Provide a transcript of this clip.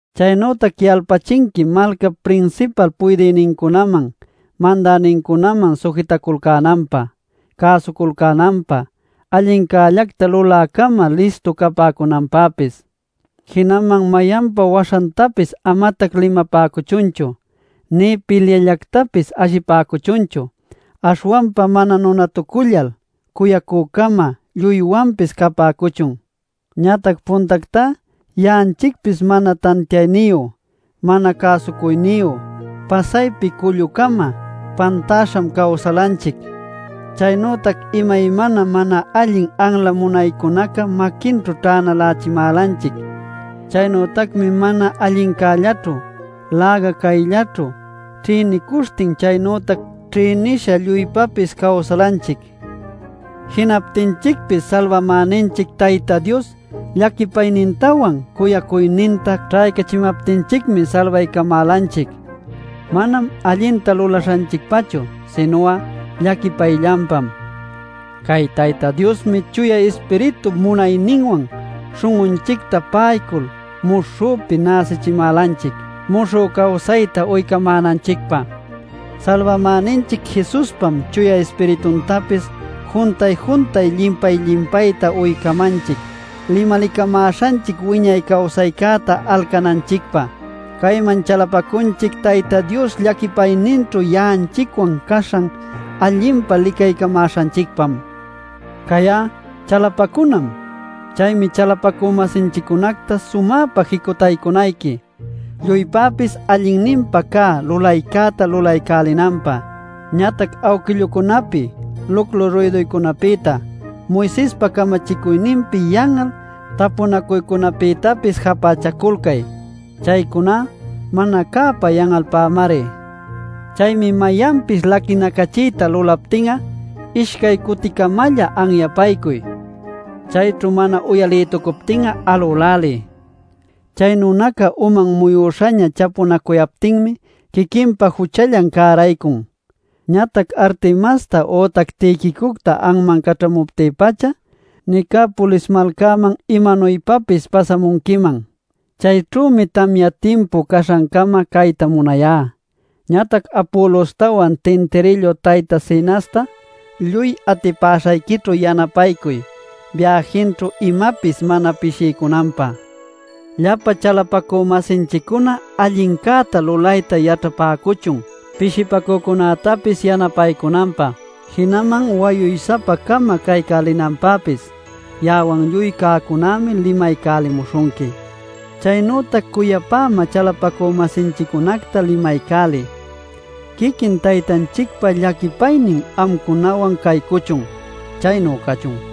Chaynütac yalpachinqui malcap prinsipal puydïnincunaman, mandänincunaman sujitaculcänanpä, cäsuculcänanpä, allincällacta lulä-cama listu capäcunanpäpis. Jinaman mayanpa waśhantapis amatac limapäcuchunchu, nï pilyallactapis ashipäcuchunchu. Aśhwanpa mana nunatucullal cuyacü-cama lluywanpis capäcuchun. Ñatac puntactá ya'anchicpis mana tantiayniyu, mana cäsucuyniyu, pasaypi cullu-cama, pantäśham cawsalanchic. Chaynütac imaymana mana allin anla munaycunaca maquinćhu ćhänalächimälanchic. Chaynütacmi mana allincällaćhu, läga cayllaćhu, ćhïnicuśhtin chaynütac ćhïnisha lluypapis cawsalanchic. Jinaptinchicpis Salbamäninchic Tayta Dios llaquipaynintawan cuyacuyninta ćhaycachimaptinchicmi salbaycamälanchic. Manam allinta lulaśhanchicpachu, sinu'a llaquipayllanpam. Cay Tayta Diosmi Chuya Ispiritup munayninwan śhun'unchicta pa'aycul muśhüpi näsichimälanchic, muśhü cawsayta uycamänanchicpä. Salbamäninchic Jesuspam Chuya Ispirituntapis juntay-juntay llimpay-llimpayta uycamanchic limalicamäśhanchic wiñay cawsaycäta alcananchicpä. Cayman chalapacunchic Tayta Dios llaquipayninćhu ya'anchicwan caśhan allinpa licaycamäśhanchicpam. Cay'a chalapacunam. Chaymi chalapacü-masinchiccunacta sumäpa jicutaycunayqui, lluypäpis allinninpa cä lulaycäta lulaycälinanpä. Ñatac awquillucunapi luclu ruyduycunapïta, Moisespa camachicuyninpi yan'al tapunacuycunapïtapis japächaculcay. Chaycuná mana cäpä yan'alpämari. Chaymi mayanpis laquinacachiyta lulaptin'a ishcay cuticamalla anyapaycuy. Chayćhu mana uyalïtucuptin'a alüläliy. Chay nunaca uman muyüśhaña chapunacuyaptinmi quiquinpa juchallan cäraycun. Ñatac Artemasta ütac Tiquicocta anman caćhamuptï-pacha, Nicapolis malcaman imanuypapis pasamunquiman. Chayćhümi tamya timpu caśhancama cayta munayá. Ñatac Apolostawan tintirillu tayta Zenasta, lluy atipäśhayquićhu yanapaycuy, biäjinćhu imapis mana pishiycunanpä. Llapa chalapacü-masinchiccuna allincäta lulayta yaćhapäcuchun pishipacücunätapis yanapaycunanpä, jinaman wayuy-sapa-cama caycälinanpäpis. Ya'awan lluy cäcunämi limaycälimuśhunqui. Chaynütac cuyapämä chalapacü-masinchiccunacta limaycäliy. Quiquin Taytanchicpa llaquipaynin amcunawan caycuchun. Chaynu cachun.